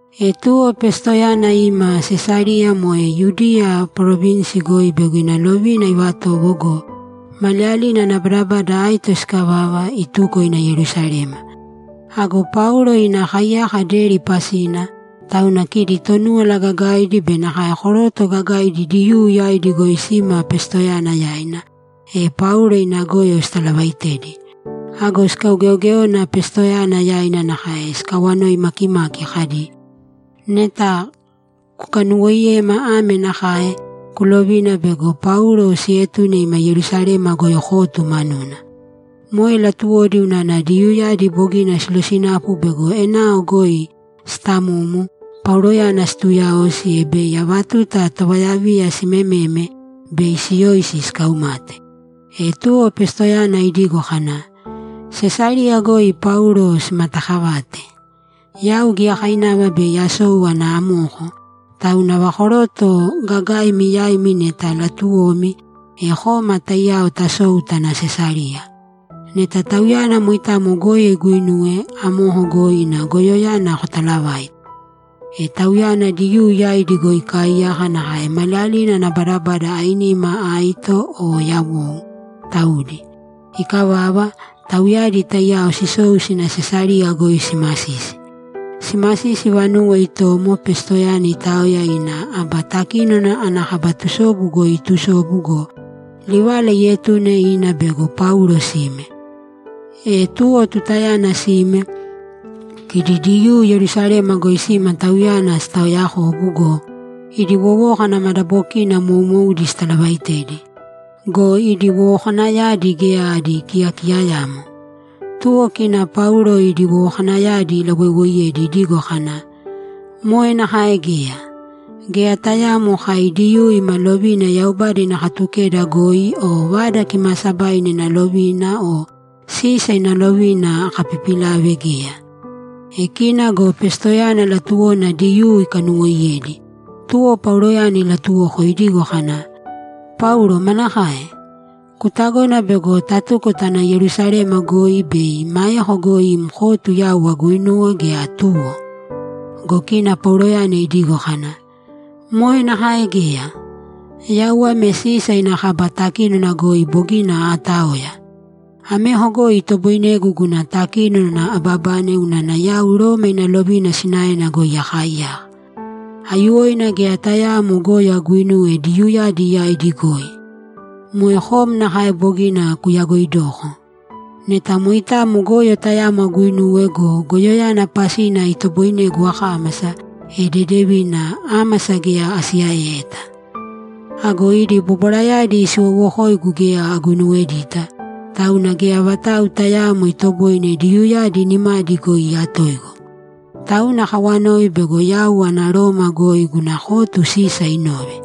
E tuwo Pestoyana ima Sesariya moe Yudiya parovinsi goi bego ina lovina ivatowo go, maliyalina ana badabada aito sikavava, ituko ina Yerusalema. Ago Paulo ina kaiyaka deri pasina, tauna kidi Tonúwala Gagaidi be nakae koroto gagaidi Diyuu yaidi goi sima Pestoyana yaina, e Paulo ina goyo sitalavaitedi. Ago sikaugeogéona Pestoyana yaina nakae sikawanoi makimaki kadi, ‘Neta kukanuwoiyema ame nakae: Kulovina bego Paulo sietune ima Yerusalema goi kotu manuna.’ Moe latuwodi unana Diyuuyadi bogina silosinapu bego enao goi sitamumu, Pauloyana situyaosi, e bei ava tuta tovayaviya simememe, bei siyoisi sikaumate. E tuwo Pestoyana idigo kana, ‘Sesariya goi Paulo simataakavate. Yau giyakainava bei asou ana amoko, tauna ava koroto gagaimi yaimi neta latuwomi, e kōma taiyao tasōu tāna Sesariya. Neta tauyana moitamo goyo iguinuwe, amoko goi ina goyoyana kotalavāite.’ E tauyana Diyuu yaidi goi ikaaiyaka nakae maliyalina ana badabada ainima aito o yawou, taudi. Ikavava, tauyadi taiyao sisou sina Sesariya goi simasisi. Simasisi vanuwo itomo Pestoyana itaoya ina aba takínona ana kaba tusobu goi itusobu go, livala ietune ina bego Paulo sime. E tuwo tutayana sime, kidi Diyuu Yerusalema goi sima tauyana sitaoyakobu go, idi wowókana madabokina moumoudi sitalavaitedi. Go idi wowokanayadi geya adi kiyakiyayamo. Tuwo kina Paulo idi wowokanayadi ilawoiwoiyedi idigo kana, ‘Moe nakae geya. Geya tayaamo kai Diyuu ima lovina Yaubada ina Katukeda goi o Vada Kimaasabaina ina lovina o Sisa ina lovina akapipilave geya.’ E kina go Pestoyana latuwona Diyuu ikanuwoiyedi, tuwo Pauloyana ilatuwoko idigo kana, ‘Paulo manakae? Kutagona bego tatuko tana Yerusalema goi bei maeko goi im kotu yau aguinuwe, gea tuwo?’ Go kina Pauloyana idigo kana, ‘Moe nakae geya! Yau ame Sisa ina kaba takínona goi bogina aataoya! Ameko goi itoboinegu guna takínona ababane unana yau Roma ina lovina sinaena goi akaaiyaka. Aiyuwoina geya tayaamo goyo aguinuwe Diyuuyadi yaidi goi! Moe kom nakae bogina kuyagoidoko. Neta moitamo goyo tayamo aguinuwe go, goyoyana pasina itoboinegu akámasa, e dedevina, ámasa geya asiyaeyeta. Ago idi bobwarayadi siwoowokoigu geya aguinuwedita, tauna geya vatau tayaamo itoboine Diyuuyadi nimadi goi iyatoigu. Tauna akawanoi bego yau ana Roma goi guna kotu Sisa inove!’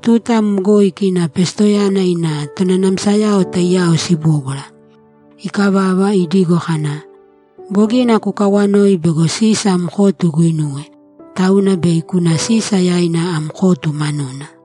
Tuta amo goi kina Pestoyana ina tonanamsayao taiyao sibóbwara. Ikavava, idigo kana, ‘Bogina kukawanoi bego Sisa am kotu iguinuwe, tauna bei kuna Sisa yaina am kotu manuna.’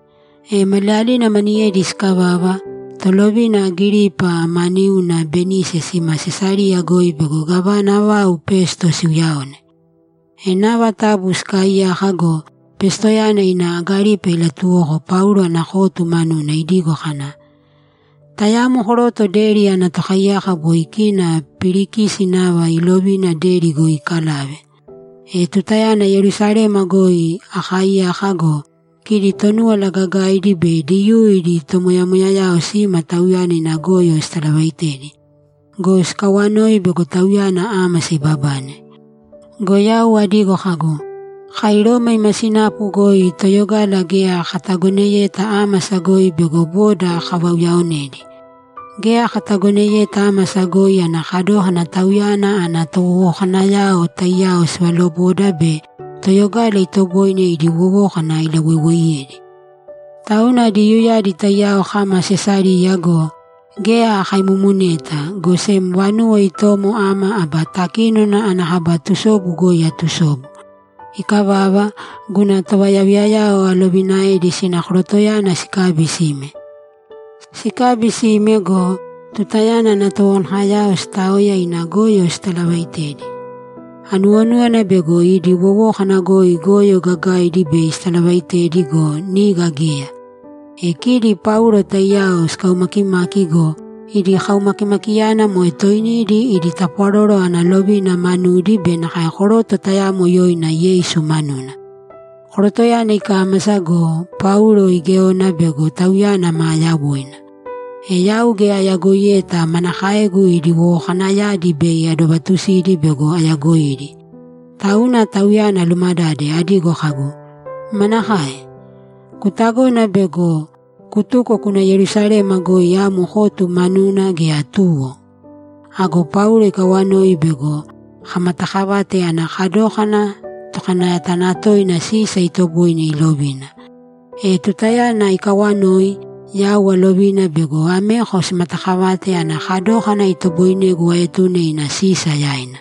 E maliyalina maniyedi sikavava, Tolovina Agiripa ma niuna Benise sima Sesariya goi bego gávana vau Pesto siuyaone. E nava tabu sikaaiyaka go, Pestoyana ina Agiripa ilatuwoko Paulo ana kotu manuna idigo kana, ‘Tayamo koroto deri ana tokaiyaka boi kina Pilikisi nava iilovina deri goi ikalave. E tutayana Yerusalema goi akaaiyaka go, kidi Tonúwala Gagaidi be Diyuu idi tomoyamoyayao sima tauyana ina goyo sitalavaitedi. Go sikawanoi bego tauyana ámasa ibabane. Go yau adigo kagu, “Kai Roma ima sinapu goi toyogala geya katagoneyeta ámasa goi bego boda kavauyaonedi. Geya katagoneyeta ámasa goi ana kadókana tauyana ana towowokanayao taiyao sivaloboda be toyogala itoboine idi wowókana ilawoiwoiyedi.” Tauna Diyuuyadi taiyao kama Sesariya go, geya akaimumuneta, go sem vanuwo itomo ama aba takínona ana kaba tusobu goi atusobu. Ikavava, guna tovayaviyayao alovinaedi sina korotoyana sikabi sime. Sikabi sime go, tutayana ana towowokanayao sitaoya ina goyo sitalavaitedi, anuwonúwana bego idi wowókana goi goyo gagaidi bei sitalavaitedi go, niga geya. E kidi Paulo taiyao sikaumakimaki go, idi kaumakimakiyana moe toinidi idi tapwaroro ana lovina manudi be nakae koroto tayamo yoina Yeisu manuna. Korotoyana ikámasa go, Paulo igéona bego tauyana maa yawoina. E yau geya ayagoiyeta manakaegu idi wowokanayadi bei adovatusidi bego ayagoidi. Tauna tauyana alumadade adigo kagu, “Manakae? Kutagona bego kutuko kuna Yerusalema goi am kotu manuna, gea tuwo?” Ago Paulo ikawanoi bego kamatakavate ana kadókana tokanayatanatoina Sisa itoboine ilovina. E tutayana ikawanoi, yau alovina bego ameko simatakavate ana kadókana itoboinegu aetune ina Sisa yaina.’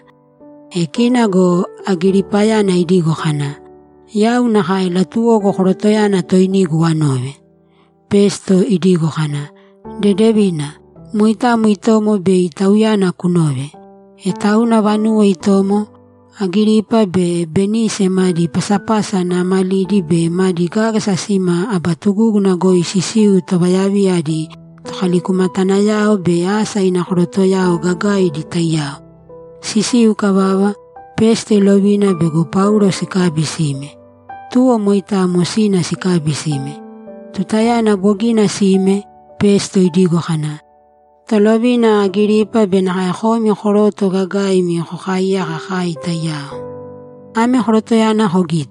E kina go Agiripayana idigo kana, ‘Yau nakae latuwogu korotoyana toinigu anove.’ Pesto idigo kana, ‘Dedevina, moitamo itomo bei tauyana kunove.’ E tauna vanuwo itomo, Agiripa be Benise madi pasapasa naamalidi be madi gágasa sima aba tugúguna goi sisiu tovayaviya adi tokalikumatanayao be asa ina korotoyao gagaidi taiyao. Sisiu ikavava, Pesto ilovina bego Paulo sikabi sime. Tuwo moitamo sina sikabi sime. Tutayana bogina sime, Pesto idigo kana, ‘Tolovina Agiripa be nakae komi koroto gagaimi kokaaiyaka kai taiyao, ame korotoyana kogīte.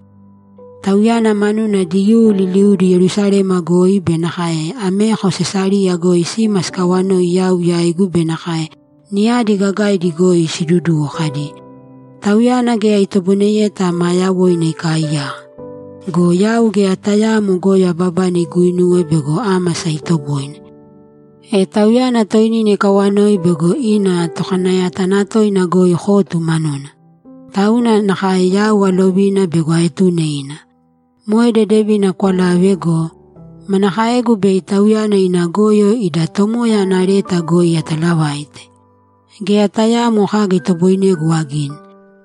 Tauyana manuna Diyuu liliudi Yerusalema goi be nakae ameko Sesariya goi sima sikawanoi yau yaigu be nakae niyadi gagaidi goi siduduwo kadi, “Tauyana geya itoboineyeta maa yawoina ikaaiyaka!” Go yau geya tayaamo goyo ababane iguinuwe bego ámasa itoboine. E tauyana toinina ikawanoi bego ina tokanayatanatoina goi kotu manuna. Tauna nakae yau alovina bego aetune ina. Moe dedevina kwalave go, manakaegu bei tauyana ina goyo ida tomoya ana leta goi atalavaite? Geya tayaamo kaga itoboinegu agini.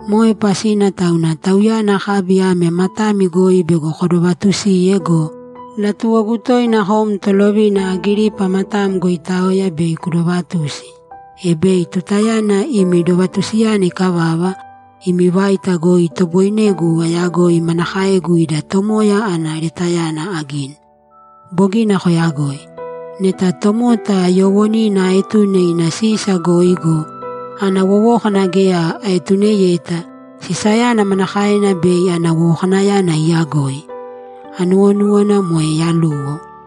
Moe pasina tauna tauyana akabi ame matami goi bego kodovatusiye go, latuwogu toina kom Tolovina Agiripa matam goi itaoya bei kudovatusi, e bei tutayana imi dovatusiyana ikavava, imi vaita goi itoboinegu ayagoi manakaegu ida tomoya ana letayana agini. Bogina koyagoi. Neta tomota yoowonina aetune ina Sisa goi go, ana wowókana geya aetuneyeta, Sisayana manakaena bei ana wowokanayana iyagoi? Anuwonúwana moe yaluwo.’